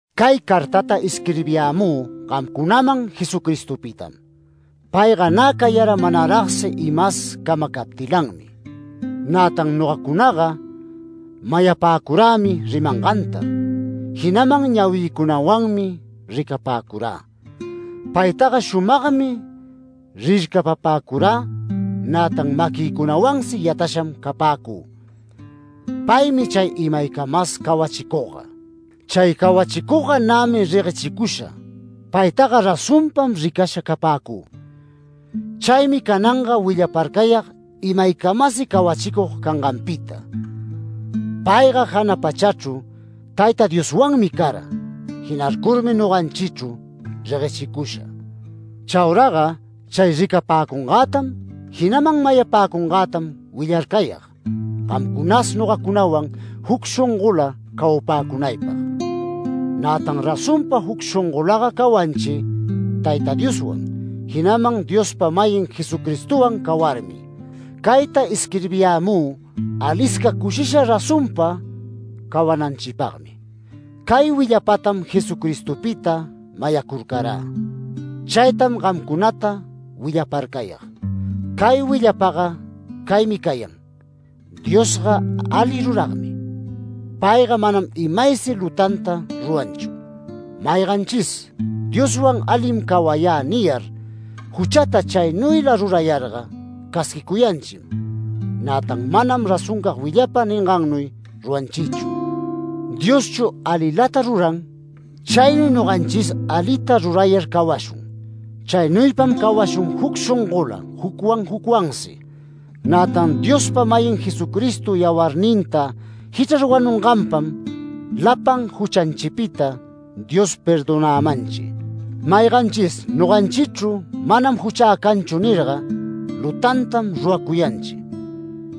Cay cartata isquirbiyämü gamcunaman Jesucristopitam. Payga nä cayara manaragsi imas camacaptilanmi. Nätan nogacunaga mayapäcurämi rimanganta, jinaman ñawïcunawanmi ricapäcurä. Paytaga shumagmi rircapapäcurä, nätan maquïcunawansi yatasham capäcü. Paymi chay imaycamas cawachicugga. Chay cawachicugga nämi reguechicusha, paytaga razonpam ricasha capäcü. Chaymi cananga willaparcayag imaycamasi cawachicug canganpita. Payga jana pachachru Tayta Dioswanmi cara. Jinarcurmi noganchichru reguechicusha. Chauraga chay ricapäcungätam, jinaman mayapäcungätam willarcayag, gamcunas nogacunawan juc shongola cawapäcunaypag. Nätan razonpa juc shongolaga cawanchi Tayta Dioswan, jinaman Diospa-mayin Jesucristowan cawarmi. Cayta isquirbiyämü alisca cushisha razonpa cawananchipagmi. Cay willapatam Jesucristopita mayacurcarä. Chaytam gamcunata willaparcayag. Cay willapaga caymi cayan: Diosga ali ruragmi. Payga manam imaysi lutanta ruranchu. Mayganchis “Dioswan alim cawayä” niyar, juchata chaynuyla rurayarga, casquicuyanchim, nätan manam razoncag willapa ningannuy ruranchichu. Dioschu alilata ruran. Chaynuy noganchis alita rurayar cawashun. Chaynuypam cawashun juc shongola jucwan jucwansi, nätan Diospa-mayin Jesucristo yawarninta jichrar wanunganpam lapan juchanchipita Dios perdonämanchi. Mayganchis noganchichru “Manam juchä canchu” nirga, lutantam ruracuyanchi.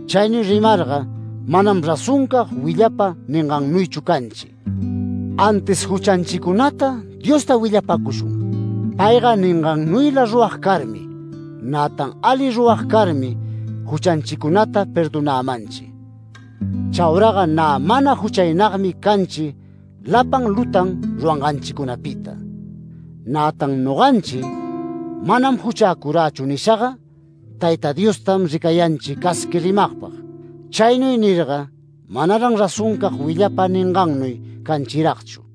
Chaynuy rimarga manam razoncag willapa ningannuychu canchi. Antis juchanchicunata Diosta willapacushun, payga ningannuyla rurag carmi, nätan ali rurag carmi, juchanchicunata perdonämanchi. Chauraga nä mana juchaynagmi canchi lapan lutan ruranganchicunapita. Nätan noganchi “Manam juchäcurächu” nishaga, Tayta Diostam ricayanchi casqui rimagpag. Chaynuy nirga manaran razoncag willapa ningannuy canchiragchu.